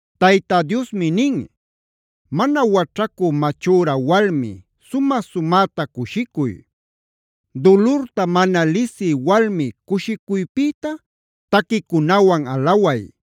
Tayta Diosmi nin: “¡Mana waćhacü machüra walmi sumä-sumäta cushicuy! ¡Dulurta mana lisï walmi cushicuypïta taquicunawan alaway!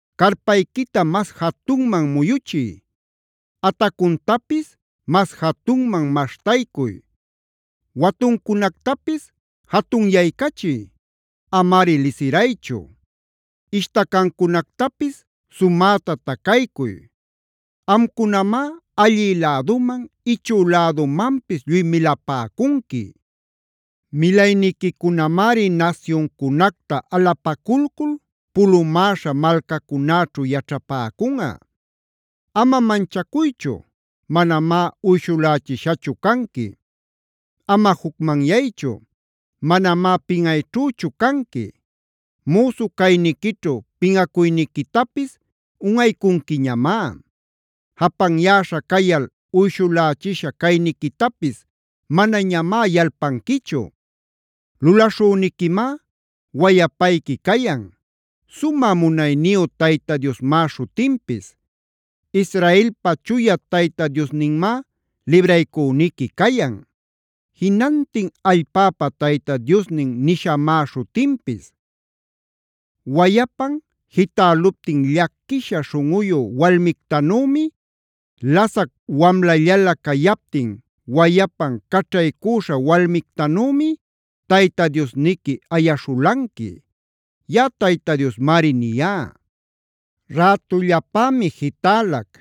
Carpayquita mas jatunman muyuchiy; atacuntapis mas jatunman maśhtaycuy; watuncunactapis jatunyaycachiy; amari lisiraychu. Ishtacancunactapis sumäta tacaycuy. Amcunamá allï läduman, ichü lädumanpis lluy milapäcunqui. Milayniquicunamari nasyuncunacta alapaculcul pulumäśha malcacunäćhu yaćhapäcunꞌa. “Ama manchacuychu; manamá uyshulächishachu canqui. Ama jucmanyaychu; manamá pinꞌayćhüchu canqui. Müsu cayniquićhu pinꞌacuyniquitapis unꞌaycunquiñamá; japanyäśha cayal uyshulächisha cayniquitapis manañamá yalpanquichu. Lulaśhüniquimá wayapayqui cayan; Sumä Munayniyu Tayta Diosmá śhutinpis. Israelpa Chuya Tayta Diosninmá libraycüniqui cayan; Jinantin Allpäpa Tayta Diosnin nishamá śhutinpis. Wayapan jitäluptin llaquisha śhunꞌuyu walmictanümi, lasac wamlallalä cayaptin wayapan caćhaycüśha walmictanümi Tayta Diosniqui ayaśhulanqui.b Yaꞌa Tayta Diosmari niyá: Rätullapämi jitälac;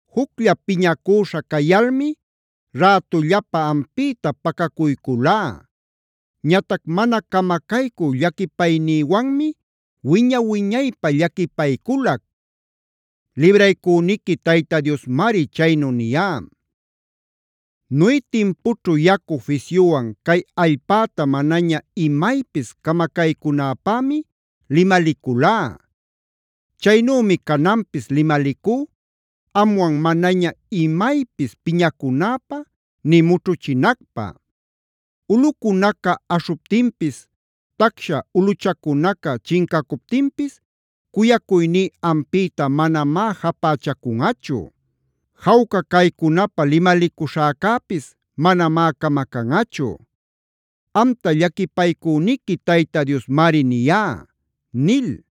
Juclla piñacüśha cayalmi rätullapa ampïta pacacuyculá. Ñatac mana camacaycü llaquipaynïwanmi wiña-wiñaypä llaquipayculac. Libraycüniqui Tayta Diosmari chaynu niyá. “Noe timpućhu yacu fisyuwan cay allpäta manaña imaypis camacaycünäpämi limaliculá.d Chaynümi cananpis limalicú amwan manaña imaypis piñacunäpä nï mućhuchinacpä. Ulꞌucunaca aśhuptinpis, tacsha ulꞌuchacunaca chincacuptinpis cuyacuyní ampïta manamá japächacunꞌachu; jawca caycunapä limalicuśhäcäpis manamá camacanꞌachu.e Amta llaquipaycüniqui Tayta Diosmari niyá” nil.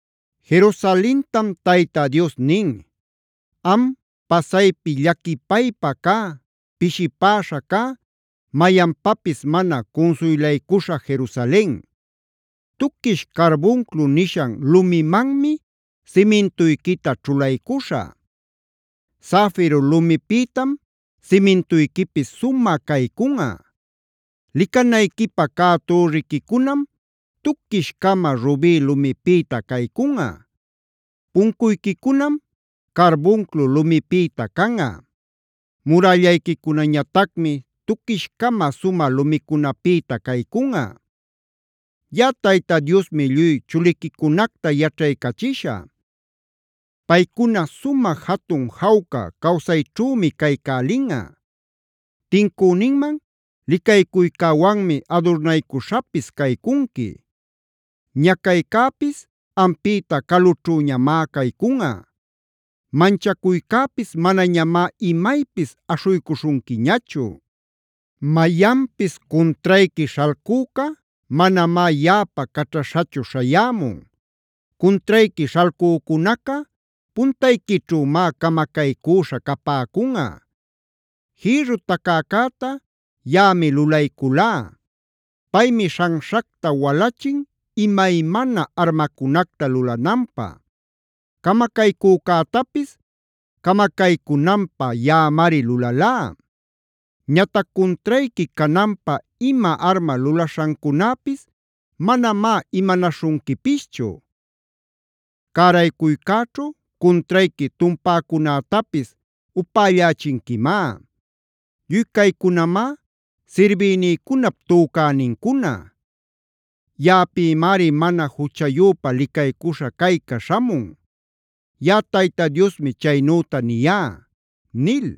Jerusalentam Tayta Dios nin: “¡Am, pasaypi llaquipaypa cä, pishipäśha cä, mayanpapis mana cunsuylaycuśha Jerusalen! Tuquish carbunclo nishan lumimanmi simintuyquita ćhulaycuśhä; zafiro lumipïtam simintuyquipis sumä caycunꞌa. Licanayquipä cä türriquicunam tuquish-cama rubi lumipïta caycunꞌa; puncuyquicunam carbunclo lumipïta canꞌa; murällayquicunañatacmi tuquish-cama sumä lumicunapïta caycunꞌa. Yaꞌa Tayta Diosmi lluy chuliquicunacta yaćhaycachishä; paycuna sumä jatun jawca cawsayćhümi caycälinꞌa. Tincüninman licaycuycäwanmi adurnaycuśhapis caycunqui. Ñacaycäpis ampïta calućhüñamá caycunꞌa; manchacuycäpis manañamá imaypis aśhuycuśhunquiñachu. Mayanpis cuntrayqui śhalcüca manamá yaꞌapa caćhaśhachu śhayämun. Cuntrayqui śhalcücunaca puntayquićhümá camacaycüśha capäcunꞌa. “Jïrru tacäcäta yaꞌami lulayculá; paymi śhanśhacta walachin imaymana armacunacta lulananpä. Camacaycücätapis camacaycunanpä yaꞌamari lulalá. Ñatac cuntrayqui cananpä ima arma lulaśhancunäpis manamá imanaśhunquipischu; cäraycuycäćhu cuntrayqui tumpäcunätapis upällachinquimá. Lluy caycunamá sirbïnïcunap tücänincuna; yaꞌapïmari mana juchayüpa licaycuśha cayca śhamun. Yaꞌa Tayta Diosmi chaynüta niyá” nil.